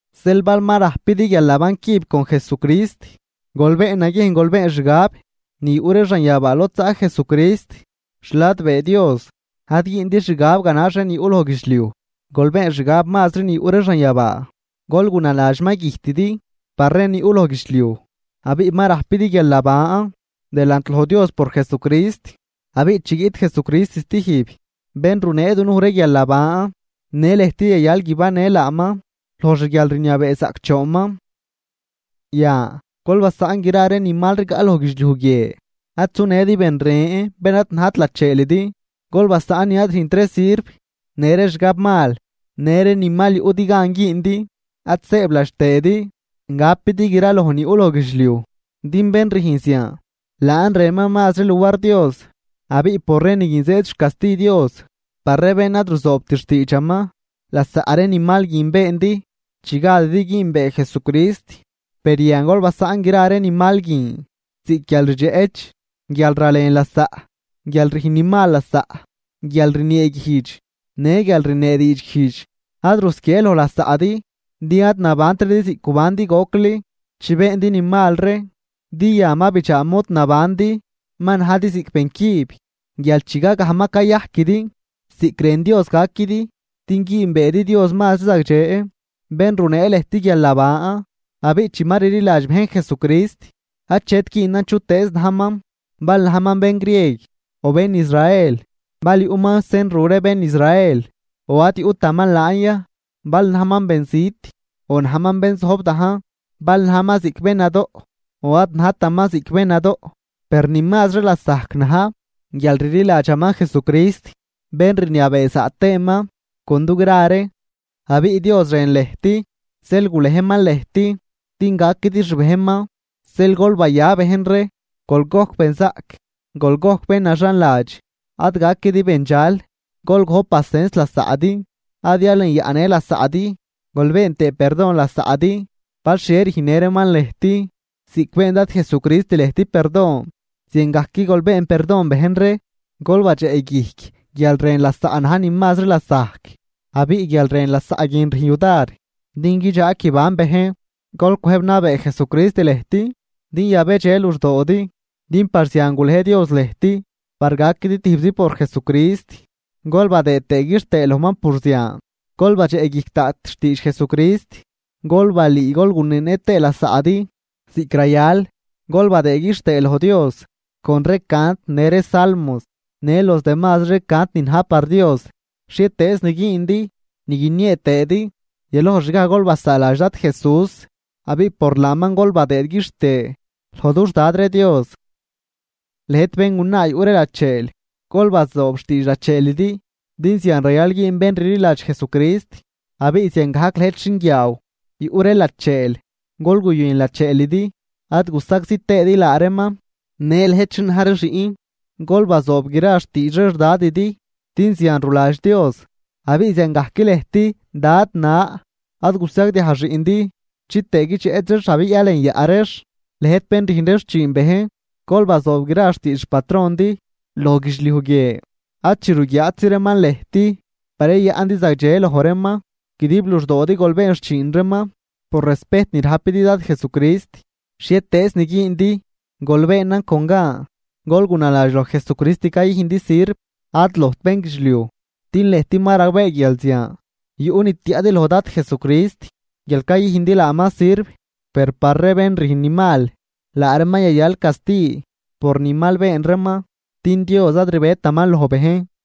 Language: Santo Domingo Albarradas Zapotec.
Zeel bal ma rajpidi guialnaban cüb con Jesucrist, gol been naguiejn gol been xgab ni yuꞌ ree xanyabaa lod zaꞌ Jesucrist xladbee Dios. Ad güündi xgab ganax ree ni yuꞌ loj guidxliuj, gol been xgab mazri ni yuꞌ ree xanyabaa. Gol gunaladx ma güjtidi par ree ni yuꞌ loj guidxliuj abiꞌ ma rajpidi guialnaban delant loj Dios por Jesucrist. Abiꞌ chi guiꞌt Jesucrist stijb, bén runee dunuj ree guialnaban, në lëjt yayal guibannë laaman loj xguialrniabee zaꞌcdxoonman. Yan, gol basaꞌn gra ree ni mal rigaꞌ loj guidxliuj guie. Ad sunëdi bén ren bén ad najt lacheelidi. Gol basaꞌn ni ad rüjnt ree sirv, në ree xgabmal në ree ni mal yuꞌdi gan güündi. Ad sëëbladx tëëdi gapidi gra loj ni yuꞌ loj guidxliuj din bén rüjn zian laan rënman mazri luar Dios. Abiꞌ por ree ni guin zëëd xcasti Dios par ree bén ad ruzoobt xtiidxaman. Lasaꞌ ree ni mal guin beendi chi gadidi güünbee Jesucrist. Per yan gol basaꞌn gra ree ni mal guin ziꞌc guialrdxeꞌch, guialralen lasaꞌ, guialrüjn ni mal lasaꞌ, guialrnieeguijdx në guial rniee diidxguijdx. Ad rusquiee loj lasaꞌdi, din ad nabantridi ziꞌc gubandi gocli chi beendi ni mal ree, din yan ma bidxaa mod nabandi. Ma najdi ziꞌc bencüb guial chigagaj ma cayajquidi ziꞌc rën Dios gaquidi din güünbeedi Dios mazri zagdxe, bén runee lëjt guialnaban. Abiꞌ chi ma rliladx bejn Jesucrist, achet güünan chutëëz najman, bal najman bén grieg o bén Israel, bal yuꞌman sen ru ree bén Israel o ad yuꞌtaman laan ya, bal najman benzit o najman bén zojb dajn, bal najman ziꞌc bén nadoꞌ o ad najtaman ziꞌc bén nadoꞌ Per ni mazri lasajc na̱j guialrliladxaman Jesucrist, bén rniabee zaꞌ tëëman con dugra ree. Abiꞌ Dios rën lëjt, zeel gulejman lëjt din gaquidi xbejnman. Zeel gol baya bejn ree, gol gojc benzaꞌc, gol gojc bén naxanladx, ad gaquidi bendxal, gol gojp pasens lasaꞌdi. Ad yalenyaꞌnë lasaꞌdi. Gol been tëë perdon lasaꞌdi bal xhie rüjnnë reeman lëjt. Ziꞌc been Dad Jesucrist lëjt perdon ziangajc gol been perdon bejn ree. Gol badxeꞌguijc guialrën lasaꞌ na̱j ni mazri lasajc. Abiꞌ guialrën lasaꞌ guin rüjn yudar din guidxaag guiban bejn. Gol cwëjb nabee Jesucrist lëjt din yabedxe luxdoodi, din par zian gulej Dios lëjt par gaquidi tijbzi por Jesucrist gol badëë tëë quixtëë lojman por zian. Gol badxeꞌguijc daꞌt xtiidx Jesucrist, gol balüü gol guneenë tëë lasaꞌdi ziꞌc rayal. Gol badëë quixtëë loj Dios con ree cant në ree salmos në los demazri ree cant ni na̱j par Dios. Xhietëëz ni güündi ni guiniee tëëdi, yaloj xgaj gol basaaladx Dad Jesús abiꞌ por laaman gol badëëd quixtëë loj dux Dad ree Dios. Lëjt béngunaa yuꞌ ree lacheel, gol bazoob xtiidx lacheelidi, din zian rayal güün bén rliladx Jesucrist. Abiꞌ ziangajc lëjt xinguiaaw yuꞌ ree lacheel, gol guyën lacheelidi ad gusagzi tëëdi laa reeman. Në lëjt xin na̱j ree xiꞌn, gol bazoob gra xtiidx ree xDadidi, din zian ruladx Dios. Abiꞌ ziangajc lëjt dad na, ad gusagdiaj xiꞌndi chitëë guidxeꞌch reex abiꞌ yalenyaꞌ reex. Lëjt bén rüjn ree xchiin bejn, gol bazoob gra xtiidx xpatrondi loj guidxliuj guie. Ad chi ruguiaatzi reeman lëjt par yayaꞌndi zagdxe loj reeman, guidib luxdoodi gol been xchiin reeman por respejt ni rajpidi Dad Jesucrist. Xhietëëz nin güündi, gol beenan con gan. Gol gunaladx loj Jesucrist cayüjndi sirv, ad lojt bénguidxliuj. Din lëjt ma ragbee guial zian yuꞌ ni tiaꞌdi loj Dad Jesucrist guial cayüjndi laaman sirv. Per par ree bén rüjn ni mal, laa reeman yayal casti por ni mal been reeman, din Dios ad rbetaman loj bejn.